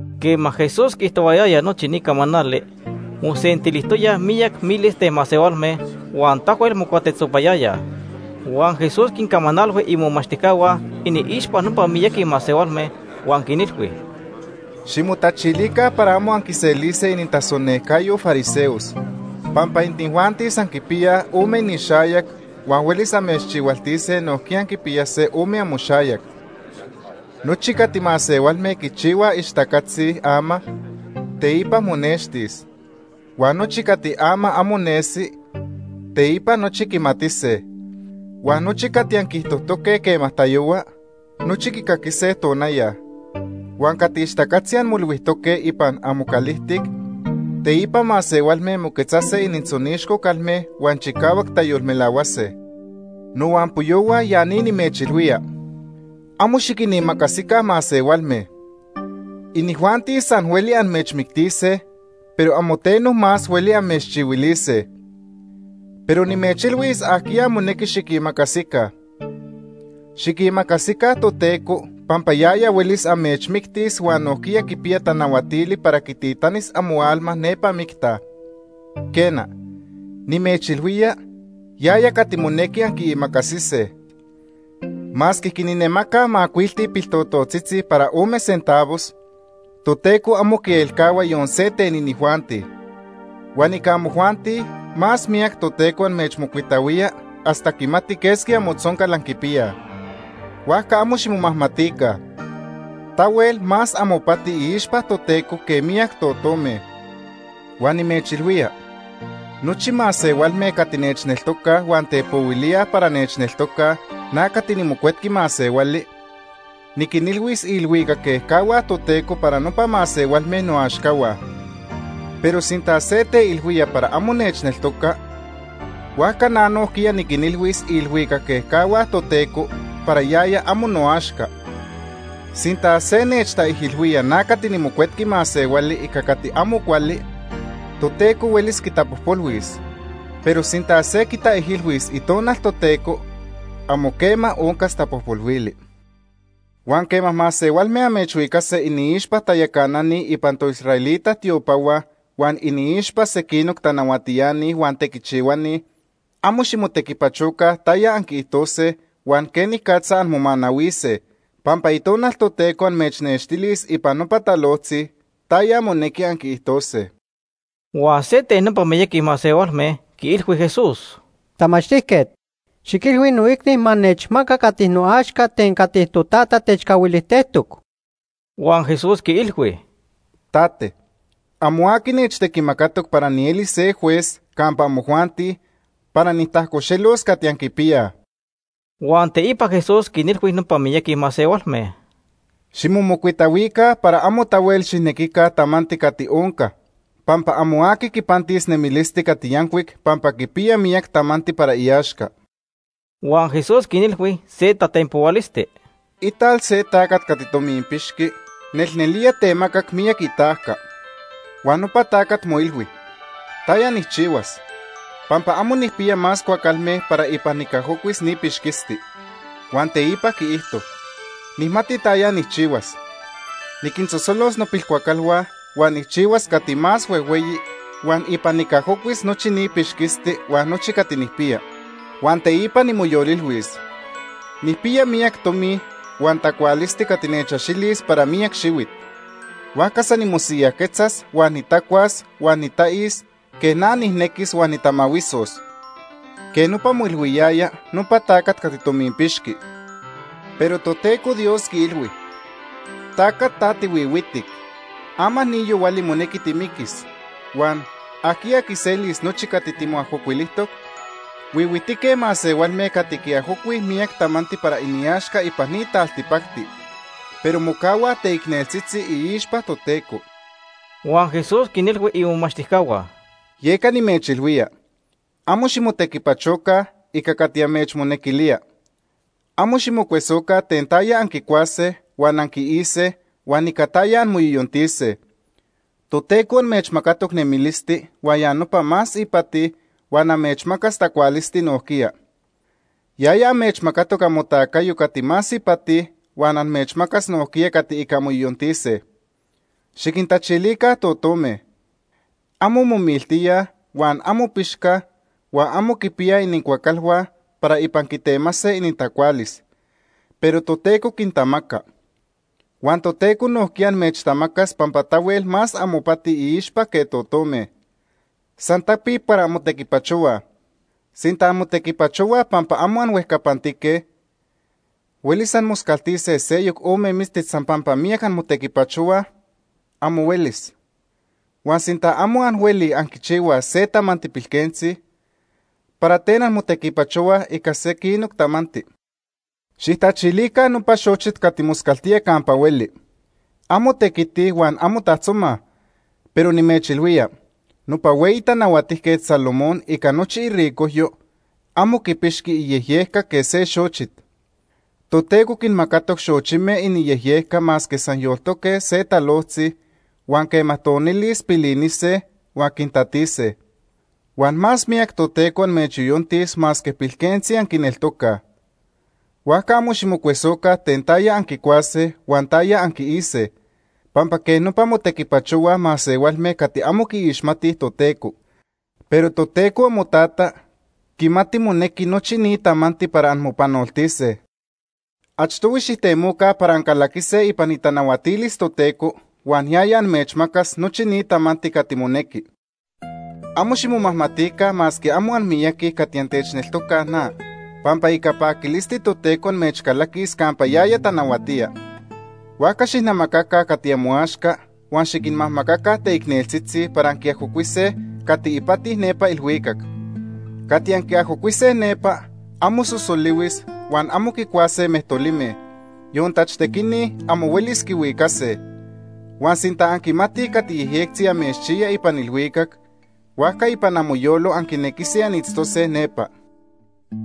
Quema Jesús quiijtohuayaya nochi ni camanali, mosentilijtoyaj miyac miles ten masehualme huan tahuel mocuatetzopayayaj. Huan Jesús quincamanalhui imomachtijcahua iniixpa nopa miyaqui masehualme huan quinilhui: “Ximotachilica para amo anquiselise inintasonejcayo fariseos pampa inijuanti san quipiyaj ome inixayac huan huelis amechchihualtise nojquiya anquipiyase ome amoxayac. Nochi cati masehualme quichihuaj ixtacatzi ama, teipa monextis. Huan nochi cati ama amo nesi, teipa nochi quimatise. Huan nochi cati anquiijtojtoque quema tayohua, nochi quicaquise tonaya. Huan cati ixtacatzi anmoilhuijtoque ipan amocalijtic, teipa masehualme moquetzase inintzonixco calme huan chicahuac tayolmelahuase. “Nohuampoyohua ya ni nimechilhuía. Amo xiquinimacasica masehualme. Inijuanti san hueli amechmictise, pero amo teno más hueli amechchihuilise. Pero nimechilhuis ajquiya monequi xiquimacasica. Xiquimacasica Toteco, pampa yaya huelis amechmictis huan nojquiya quipiya tanahuatili para quititanis amoalma nepa micta. Quena, nimechilhuía, yaya cati monequi anquiimacasise. “Masque quinamacaj macuilti piltototzitzi para ome centavos, Toteco amo quielcahua yon se ten inijuanti. Huan ica amojuanti más miyac Toteco amechmocuitahuía hasta quimati quesqui amotzoncal anquipiyaj. Huajca amo ximomajmatica. Tahuel más amopati iixpa Toteco que miyac totome. “Huan nimechilhuía, nochi masehualme cati nechneltocaj huan tepohuilíaj para nechneltocaj, na cati niMocuetqui Masehuali, niquinilhuis iilhuicac ejcahua Toteco para nopa masehualme noaxcahua. Pero sinta se teilhuía para amo nechneltoca, huajca na nojquiya niquinilhuis iilhuicac ehuani Toteco para yaya amo noaxca. “Sinta se nechtaijilhuía na cati niMocuetqui Masehuali ica cati amo cuali, Toteco huelis quitapojpolhuis. Pero sinta se quitaijilhuis Itonal Toteco, amo quema oncas tapojpolhuili. “Huan quema masehualme amechhuicase iniixpa tayacanani ipan toisraelita tiopahua huan iniixpa sequinoc tanahuatiani huan tequichihuani, amo ximotequipachoca taya anquiijtose huan quenicatza anmomanahuise, pampa Itonal Toteco amechnextilis ipan nopa talojtzi taya monequi anquiijtose.” Huan se ten nopa miyaqui masehualme quiilhui Jesús: ―Tamachtijquet, xiquilhui noicni ma nechmaca cati noaxca ten cati totata techcahuilijtejtoc. Huan Jesús quiilhui: ―Tate, amo aqui nechtequimacatoc para nielis se juez campa amojuanti para nijtajcoxelos cati anquipiyaj. Huan teipa Jesús quinilhui nopa miyaqui masehualme: ―Ximomocuitahuica para amo tahuel xijnequica tamanti cati onca, pampa amo aqui quipantis nemilisti cati yancuic pampa quipiya miyac tamanti para iaxca. Huan Jesús quinilhui se tatenpohualisti: “Ital se tacat cati tominpixqui nelnelía temacac miyac itajca. Huan nopa tacat moilhui: ‘¿Taya nijchihuas?, pampa amo nijpiya más cuacalme para ipan nicajocuis ni pixquisti.’ Huan teipa quiijto: ‘Nijmati taya nijchihuas. Niquinsosolos nopilcuacalhua huan nijchihuas cati más huejhueyi huan ipan nicajocuis nochi ni pixquisti huan nochi cati nijpiya.’ Huan teipa nimoyolilhuis: ‘Nijpiya miyac tomi huan tacualisti cati nechaxilis para miyac xihuit, huajca san nimosiyajquetzas, huan nitacuas huan nitais quej na nijnequis huan nitamahuisos.’ Quej nopa moilhuiyaya nopa tacat cati tominpixqui. Pero Toteco Dios quiilhui: ‘Tacat ta tihuihuitic. Ama ni yohuali monequi timiquis, huan ¿ajquiya quiselis nochi cati timoajocuilijtoc?’ Huihuitique masehualme cati quiajocuij miyac tamanti para iniaxca ipan ni taltipacti, pero mocahuaj teicneltzitzi iixpa Toteco.” Huan Jesús quinilhui imomachtijcahua: “Yeca nimechilhuía, amo ximotequipachoca ica cati amechmonequilía. Amo ximocuesoca ten taya anquicuase huan anquiise huan ica taya anmoyoyontise. Toteco amechmacatoc nemilisti huan ya nopa más ipati huan amechmacas tacualisti nojquiya. Yaya amechmacatoc amotacayo cati más ipati huan amechmacas nojquiya cati ica anmoyoyontise. Xiquintachilica totome. Amo momiltíaj, huan amo pixcaj huan amo quipiyaj inincuacalhua para ipan quitemase inintacualis, pero Toteco quintamaca. Huan Toteco nojquiya amechtamacas pampa tahuel más amopati iixpa que totome. San tapic para anmotequipachohuaj. Sinta anmotequipachohuaj pampa amo anhuejcapantique, ¿huelis anmoscaltise seyoc ome mistit san pampa miyac anmotequipachohuaj? Amo huelis. Huan sinta amo anhuelij anquichihuaj se tamanti pilquentzi, ¿para ten anmotequipachohuaj ica sequinoc tamanti? “Xijtachilica nopa xochit cati moscaltía campa hueli. Amo tequitij huan amo tajtzomaj, pero nimechilhuía, nopa hueyi Tanahuatijquet Salomón ica nochi iricojyo amo quipixqui iyejyejca quej se xochit. Toteco quinmacatoc xochime iniyejyejca masque san yoltoque se talojtzi, huan quema tonilis pilinise huan quintatise. Huan más miyac Toteco amechyoyontis masque pilquentzi anquineltocaj. Huajca amo ximocuesoca ten taya anquicuase huan taya anquiise, pampa quej nopa motequipachohuaj masehualme cati amo quiixmatij Toteco, pero Toteco amoTata quimati monequi nochi ni tamanti para anmopanoltise. Achtohui xijtemoca para ancalaquise ipan itanahuatilis Toteco huan yaya amechmacas nochi ni tamanti cati monequi. “Amo ximomajmatica masque amo anmiyaqui cati antechneltocaj na, pampa ica paquilisti Toteco amechcalaquis campa yaya tanahuatía. Huajca xijnamacaca cati amoaxca huan xiquinmajmacaca teicneltzitzi para anquiajocuise cati ipati nepa ilhuicac. Cati anquiajocuise nepa amo sosolihuis huan amo quicuase mejtolime, yon tachtequini amo huelis quihuicase. Huan sinta anquimatij cati yejyectzi amechchiya ipan ilhuicac, huajca ipan amoyolo anquinequise anitztose nepa.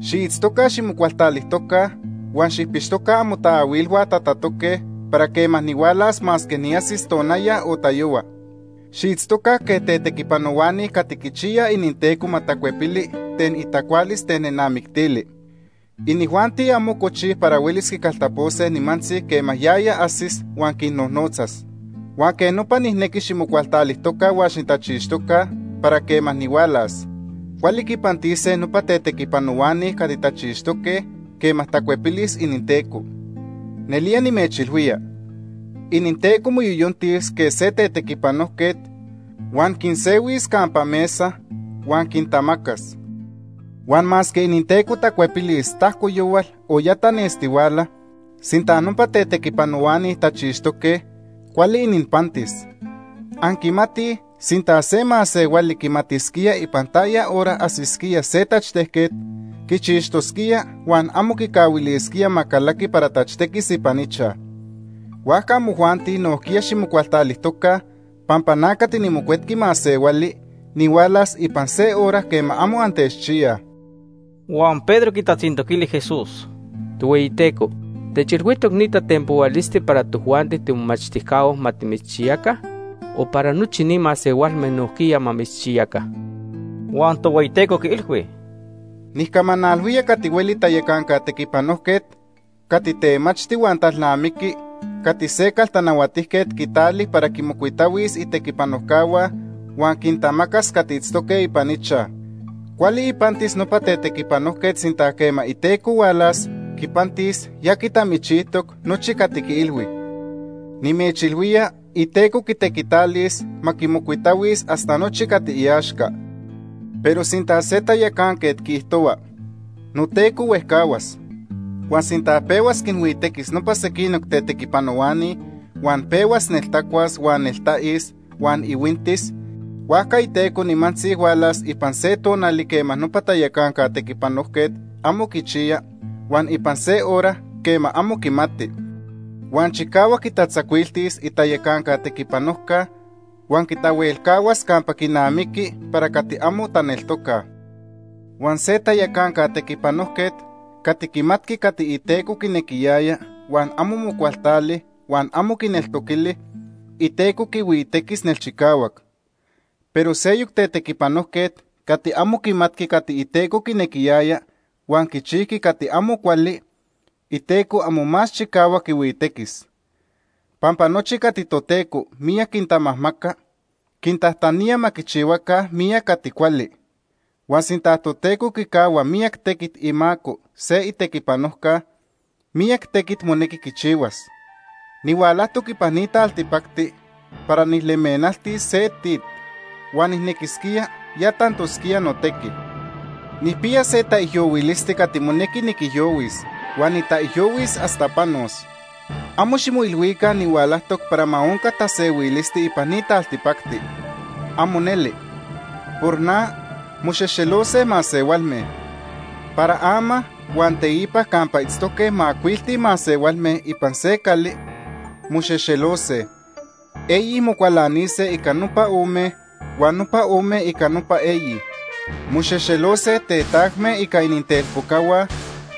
“Xiitztoca ximocualtalijtoca huan xijpixtoca amotaahuilhua tatatoque para quema nihualas masque niajsis tonaya o tayohua. Xiitztoca quej tetequipanohuani cati quichiyaj ininteco ma tacuepili ten itacualis ten nenamictili. Inijuanti amo cochij para huelis quicaltapose nimantzi quema yaya ajsis huan quinnojnotzas. Huan quej nopa nijnequi ximocualtalijtoca huan xitachixtoca para quema nihualas. Cuali quipantise nopa tetequipanohuani cati tachixtoque quema tacuepilis ininteco. Nelía nimechilhuía, ininteco moyoyontis quej se tetequipanojquet huan quinsehuis campa mesa huan quintamacas. Huan masque ininteco tacuepilis tajcoyohual o ya tanestihuala, sinta nopa tetequipanohuani tachixtoque, cuali ininpantis. Anquimatij sinta se masehuali quimatisquía ipan taya hora ajsisquía se tachtejquet, quichixtosquía huan amo quicahuilisquía ma calaqui para tachtequis ipan ichaj. Huajca amojuanti nojquiya ximocualtalijtoca pampa na cati niMocuetqui Masehuali nihualas ipan se hora quema amo antechchiyaj.” Huan Pedro quitatzintoquili Jesús: ―Tohueyiteco, ¿techilhuijtoc ni tatenpohualisti para tojuanti timomomachtijcahua ma timitzchiyaca o para nochi ni masehualme nojquiya ma mitzchiyaca? Huan Tohueyiteco quiilhui: “Nijcamanalhuía cati hueli tayacanca tequipanojquet cati temachti huan talnamiqui cati se caltanahuatijquet quitali para quinmocuitahuis itequipanojcahua huan quintamacas cati itztoque ipan ichaj. Cuali ipantis nopa tequipanojquet sinta quema iteco hualas, quipantis ya quitamichijtoc nochi cati quiilhui. Nimechilhuía iteco quitequitalis ma quimocuitahuis hasta nochi cati iaxca. Pero sinta se tayacanquet quiijtohua: ‘Noteco huejcahuas.’ Huan sinta pehuas quinhuitequis nopa sequinoc tetequipanohuani, huan pehuas neltacuas huan neltais huan ihuintis, huajca iteco nimantzi hualas ipan se tonali quema nopa tayacanca tetequipanojquet amo quichiya, huan ipan se hora quema amo quimati. Huan chicahuac quitatzacuiltis itayacanca tequipanojca huan quitahuelcahuas campa quinamiqui para cati amo taneltocaj. “Huan se tayacanca tetequipanojquet cati quimatqui cati iteco quinequiyaya huan amo mocualtali huan amo quineltoquili, iteco quihuitequis nelchicahuac. Pero seyoc tetequipanojquet cati amo quimatqui cati iteco quinequiyaya, huan quichijqui cati amo cuali, iteco amo más chicahuac quihuitequis. Pampa nochi cati Toteco miyac quintamajmaca, quintajtanía ma quichihuaca miyac cati cuali. Huan sinta Toteco quicahua miyac tequit imaco se itequipanojca, miyac tequit monequi quichihuas. “Nihualajtoc ipan ni taltipacti para nijlemenaltis se tit. Huan nijnequisquía ya tantosquía notequi. Nijpiya se taijyohuilisti cati monequi niquijyohuis huan nitaijyohuis hasta panos. Amo ximoilhuica nihualajtoc para ma onca tasehuilisti ipan ni taltipacti. ¡Amo neli! Por na, moxexelose masehualme. Para ama huan teipa campa itztoque macuilti masehualme ipan se cali, moxexelose. Eyi mocualanise ica nopa ome, huan nopa ome ica nopa eyi. Moxexelose tetajme ica inintelpocahua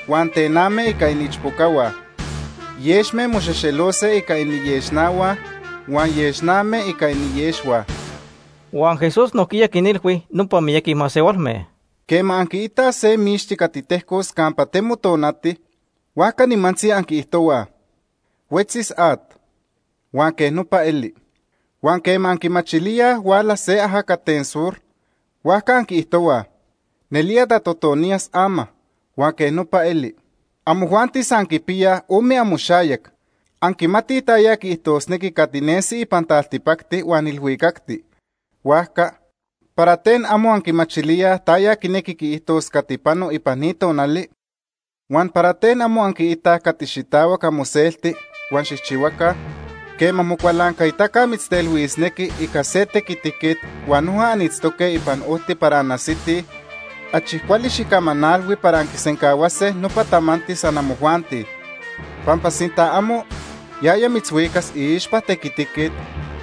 huan tename ica iniichpocahua. Yexme moxexelose ica iniyexnahua, huan yexname ica iniyexhua.” Huan Jesús nojquiya quinilhui nopa miyaqui masehualme: “Quema anquiitaj se mixti cati tejcos campa temo tonati, huajca nimantzi anquiijtohuaj: ‘Huetzis at’, huan quej nopa eli. Huan quema anquimachilíaj huala se ajacat ten sur, huajca anquiijtohuaj: ‘Nelía tatotoniyas ama.’ Huan quej nopa eli. Amojuanti san anquipiyaj ome amoxayac. Anquimatij taya quiijtosnequi cati nesi ipan taltipacti huan ilhuicacti, huajca ¿para ten amo anquimachilíaj taya quinequi quiijtos cati pano ipan ni tonali? “Huan, ¿para ten amo anquiitaj cati xitahuac amoselti huan xijchihuaca? Quema mocualancaitaca mitztelhuisnequi ica se tequitiquet huan noja anitztoque ipan ojti para anajsitij, achi cuali xijcamanalhui para anquisencahuase nopa tamanti san amojuanti. Pampa sinta amo, yaya mitzhuicas iixpa tequitiquet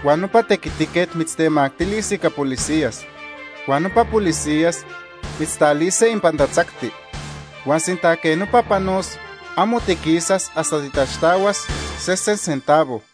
huan nopa tequitiquet mitztemactilis ica policías, huan nopa policías mitztalise ipan tatzacti. Huan sinta quej nopa panos, amo tiquisas hasta titaxtahuas sesen centavo.”